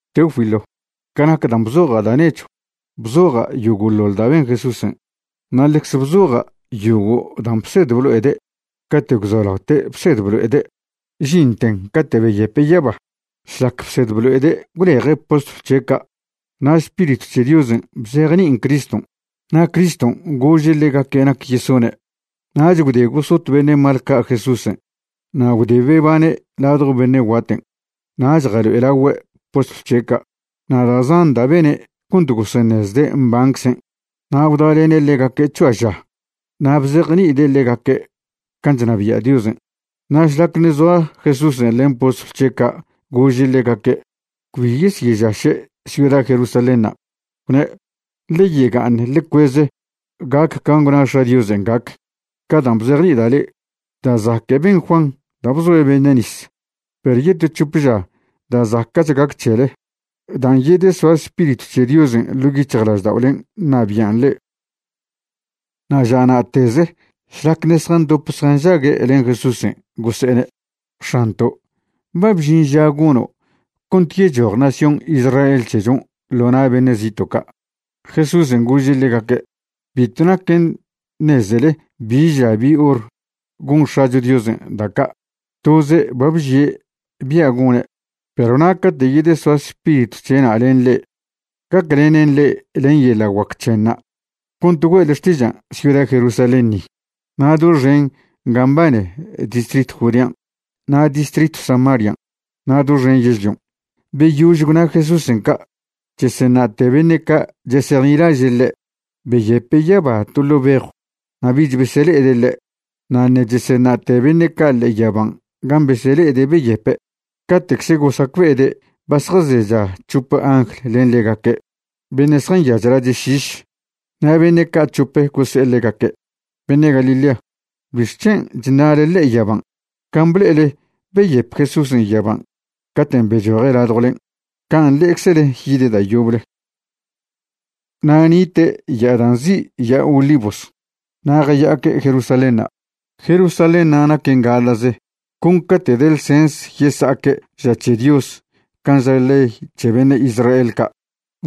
Teófilo, ca nac dan' bzoja' da' nechw, bzoja' yogo'ḻoḻ da' ben Jesúsen', na' ḻecze bzoja' yogo' dan' bsed blo'ede' cate' gwzolaote' bsed blo'ede' žinten cate' beyepe' yaba. Šlac bsed blo'ede' gwleje' postlw c̱he' ca', na' Spiritw c̱he Diosen' bzejni'in Criston', na' Criston' gože' ḻegaque' nac yesone'. Nach gwde gosot beṉe' mal ca' Jesúsen' na' gwde bebane' ladjo bene' guaten' nach jalo'elagüe' postlw c̱he' ca'. Na' da' zan da' bene' cont goseṉezde' mbanczen'. Na' gwdalene' ḻegaque' c̱hoa ža na' bzejni'ide' ḻegaque' can' chnabia' Diosen'. Na' šlac ṉe' zoa Jesúsen' len postlw c̱he' ca' gože' ḻegaque' cbi yesyežaše' ciuda Jerusalénṉa'. Gwne': ―Ḻe yega'aṉ ḻe cueze gac can' gwna X̱a' Diosen' gac, ca dan' bzejni'ida' le'e. Da' zaque' ben Juan da' bzoe' beṉe' nis, perw yeto c̱hope ža da' zaca'ch gac c̱hele dan' yedesoa Spiritw c̱he Diosen' ḻo' yic̱hjlažda'olen' ṉabi'an le'e. Na' ža na'teze šlac ṉe' zjandop zjanžague' len Jesúsen' gose'ene': ―X̱anto' ¿ba bžin ža gono' cont yechoj nación Israel c̱hechon' ḻo na' beṉe' zito' ca'? Jesúsen' gože' ḻegaque': ―Bitw naquen ṉezele bi ža bi hor gon X̱acho Diosen' da' ca' toze' ba bžie' bia' gone'. Perw na' cate' yedesoa Spiritw c̱he'na' len le'e, gaclenen le'e len yeḻa' guac c̱henṉa' cont güe'le xtižan' ciuda Jerusalén ni, na' doxen ga mbane distritw Judean', na' distritw Samarian', na' doxen yežlion'. Beyož gwna Jesúsen' ca', cheseṉa'te beṉe' ca' chesejnilaže' ḻe', beyepe' yaba to ḻo' bejw na' bich besele'ede' ḻe'. Na' ṉe' cheseṉa'te beṉe' ca' ḻe'e yaban' gan' besele'ede' beyepe', cate'cze gosacbe'ede' ba zjazecha c̱hope angl len ḻegaque' beṉe' zjanyaz lache' šiš. Na' beṉe' ca' c̱hope gose'e ḻegaque': ―Beṉe' Galilea, ¿bixc̱hen' chṉa'le ḻe'e yaban'? Can' ble'ele beyep Jesúsen' yaban' caten' bechoje' ladjwlen', can' le'eczele yide' da' yoble. Na' nite' ya'a dan' nzi' Ya'a Olivos na' jaya'aque' Jerusalénṉa'. Jerusalénṉa' naquen gaḻa'ze con ca'te' de ḻsens yesa'aque' ža c̱he Dios can' ža ley c̱he beṉe' Israel ca'.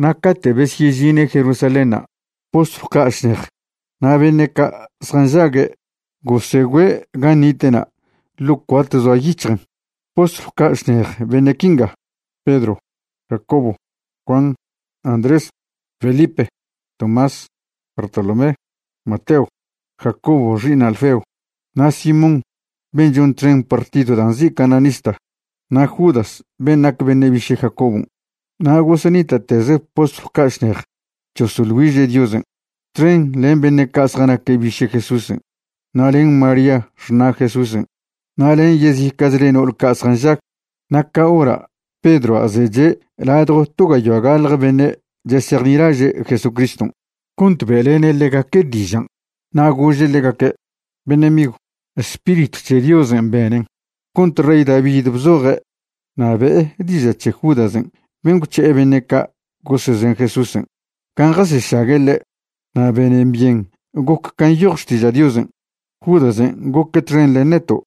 Na' cate' besyežine' Jerusalénṉa' postlw ca' šnej na' beṉe' ca' zjanžague' gosegüe' gan' nite'na' ḻo' cuart zoa yic̱hjen'. Postlw ca' šnej beṉe' quinga: Pedro, Jacobo, Juan, Andrés, Felipe, Tomás, Bartolomé, Mateo, Jacobo xi'iṉ Alfeo, na' Simón ben' chon txen partid dan' nzi' cananista, na' Judas ben' nac beṉe' biše' Jacobon'. Na' gosenita'teze postlw ca' šnej chosoḻ güiže' Diosen' txen len beṉe' ca' zjanaque' biše' Jesúsen' na' len María xṉa' Jesúsen' na' len yezica'chle no'ol ca' zjanžag. Na' ca hora' Pedroa' zeche' ladjo to gayoa gaḻje beṉe' chesejnilaže' Jesucriston' cont be'lene' ḻegaque' dižan', na' gože' ḻegaque': ―Beṉe' migw, Spiritw c̱he Diosen' benen cont rey David bzoje' na' be'e diža' c̱he Judasen' ben' gwc̱he' beṉe' ca' gosezen Jesúsen' gan' jasešague' ḻe'. Na' benen byen goc can' nyoj Xtiža' Diosen'. Judasen' goque' txen len neto'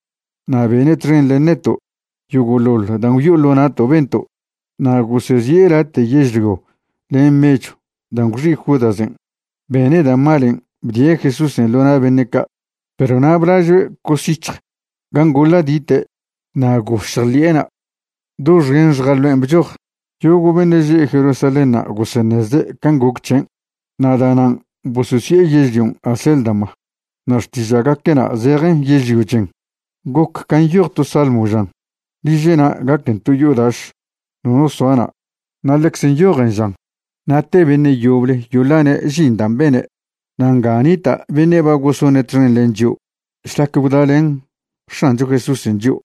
na' bene' txen len neto' yogo'ḻoḻ dan' gwyo'o ḻo na'to' bento'. Na' gosezi'e late' yežlio len mechw dan' gwxi' Judasen' bene' da' malen' bdie' Jesúsen' ḻo na' beṉe' ca'. Perw na' blažoe' cosyic̱hj gan' goḻadite' na' gošj ḻi'ena', doxen xjaloen' bchoj. Yogo' beṉe' že' Jerusalénṉa' goseṉezde' can' goc c̱hen' na' da'nan' bososi'e yežlion' Acéldama na' xtiža'gaque'na' zejen Yežlio Chen. Goc can' nyoj to salmo žan: Liže'na' gaquen to yo'o daš, nono soa na'. Na' ḻecze nyojen žan: Na' te beṉe' yoble yoḻane' žin dan' bene'. ’Na' nga nita' beṉe' ba gosone' txen len chio' šlac gwdalen X̱ancho Jesúsen' chio'.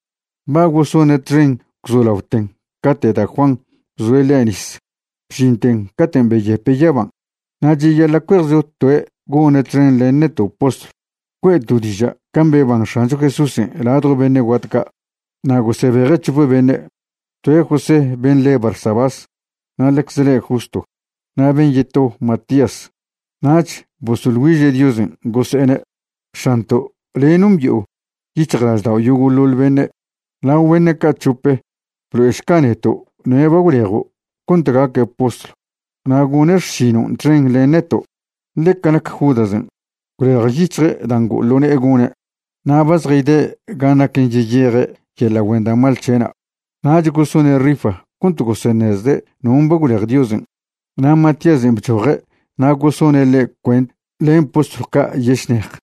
Ba gosone' txen gwzolaoten cate' da' Juan bzoe' ḻe' nis bžinten caten' beyepe' yaban', na' cheyaḻa' cuejcho toe' gone' txen len neto' postlw güe'to' diža' can' beban X̱ancho Jesúsen' ladjo beṉe' guat ca'. Na' gosebeje' c̱hope beṉe', toe' José ben' le Barsabás, na' ḻecz le' Justo, na' ben' yeto Matías. Nach bosoḻ güiže' Diosen' gose'ene': ―X̱anto', le' nombi'o yic̱hjlaždao' yogo'ḻoḻ beṉe'. Lao beṉe' ca' c̱hope blo'ešca neto' noe' ba gwlejo' cont gaque' postlw na' gone' xšinon' txen len neto'. Ḻe ca nac Judasen', gwlejyic̱hje' dan' ngo'o ḻo ne'e gone' na' ba zjayde' gan' naquen yeyeje' yeḻa' güen da' mal c̱he'na'. Nach gosone' rifa cont goseṉezde' non' ba gwlej Diosen' na' Matíasen' bchoje' na' gosone' ḻe' cuent len postlw ca' yešnej.